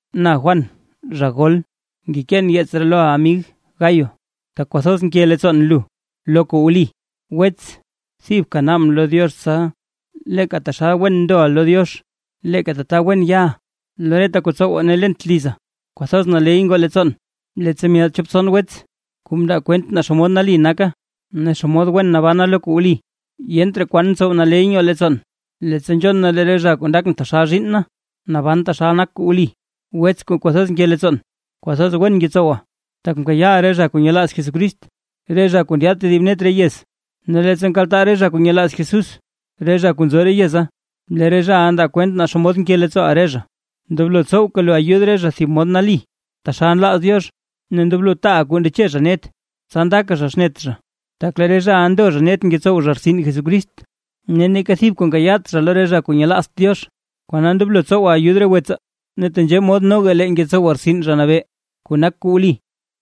Na Juan, zha gol. Ngekeen yeets ree loʼa amig Gayo, tak kwathoz nke leettsoon lu lo kuu wli. Wets, thibka naabʼn lo Diox tsa leeka taxal wen ndoʼa lo Diox, leeka tata wen yaʼa lo reta kuu ntsowa ne lent liza. Kwathoz naley ngoo leettsoon, leettsa myaad chop tson wets, kuu mndaa kwent naa xomod nali naka, ne xomod wen nabana lo kuu wli. Yent raa kwan ntsow naley nyoo leettsoon, leettsa nzhon na lee re zha kuu ndakʼn taxal zhiinn na, naban taxal nak kuu wli. Wets kuu kwathoz nke leettsoon, kwathoz wen ngetsowa, tak nkayaaʼa re zha kuu nyelaaz Jesucrist, re zha kuu ndyaad tedib net re yez. Ne leettsa nkaltaa re zha kuu nyelaaz Jesús, re zha kuu nzo re yeza, lee re zhaʼa ndaa kwent naa xomod nke leettsooʼa re zha. Ndoblo tsowka lu ayud re zha thib mod nali, taxal nlaaz Diox ne ndoblo taaʼa kuu ndeche zha net, tsa ndaka zha xnet zha. Tak lee re zhaʼa ndo zha net ngetsow zha rtsin Jesucrist, ne neeka thib kuu nkayaat zha lo re zha kuu nyelaazt Diox. Kona ndoblo tsowaa ayud re wetsaa. Ne tenzhee mod noga lee ngetsowaa rtsin Zha Nabee kuu nak kuu wli.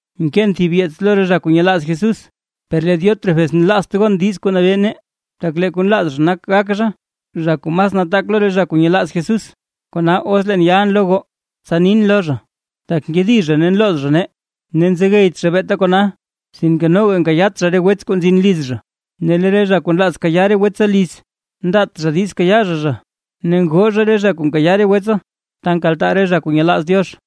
Mkeen thib yeets lo re zha kuu nyelaaz Jesús, per lee Diótrefes nlaazt gon diiz kuu nabee nee, tak lee kuu nlaaz zha nak gak zha, zha kuu mas nataak lo re zha kuu nyelaaz Jesús. Kona, os leen yalʼn lo goo, tsa nin lo zha, tak nkedi zha ne nlooz zha nee. Ne nzegeyt zha beeta kona, sinke noga nkayaat zha re wets kuu nzin liz zha, ne lee re zha kuu nlaaz kayaa re wetsaa liz, ndaat zha diiz kayaa zha zha, ne ngoo zha re zha kuu nkayaa re wetsaa ta nkaltaa re zha kuu nyelaaz Diox.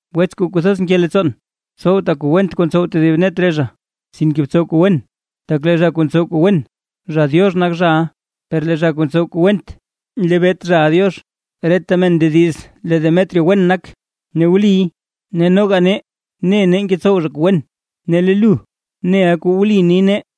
Wets kuu kwathoz nke leettsoon. Tsowta kuu went kuu ntsow tedib net re zha, sinke btsow kuu wen. Tak lee zha kuu ntsow kuu wen, zha Diox nak zhaʼa, per lee zha kuu ntsow kuu went, nlebeet zhaʼa Diox. Reta men ndediz lee Demetrio wen nak, ne wliy. Ne noga nee ne ngetsow zha kuu wen, ne lee lu neʼa kuu wli ni nee.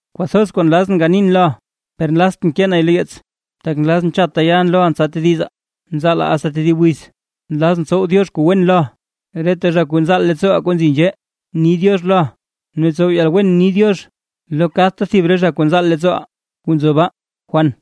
Kwathoz kuu nlazʼn ganin loʼa, per nlaaztʼn kee nay lo yeets, tak nlazʼn chatta yalʼn loʼa tsa tedizaa. Nzaalaa asta tedib wiz, nlazʼn tsow Diox kuu wen loʼa. Reta zha kuu nzaal leettsooʼaa kuu nzi nzhee ni “diox” loʼa; ne tsow yalwen ni “diox” lo kadta thib re zha kuu nzaal leettsooʼaa kuu nzo baa. Juan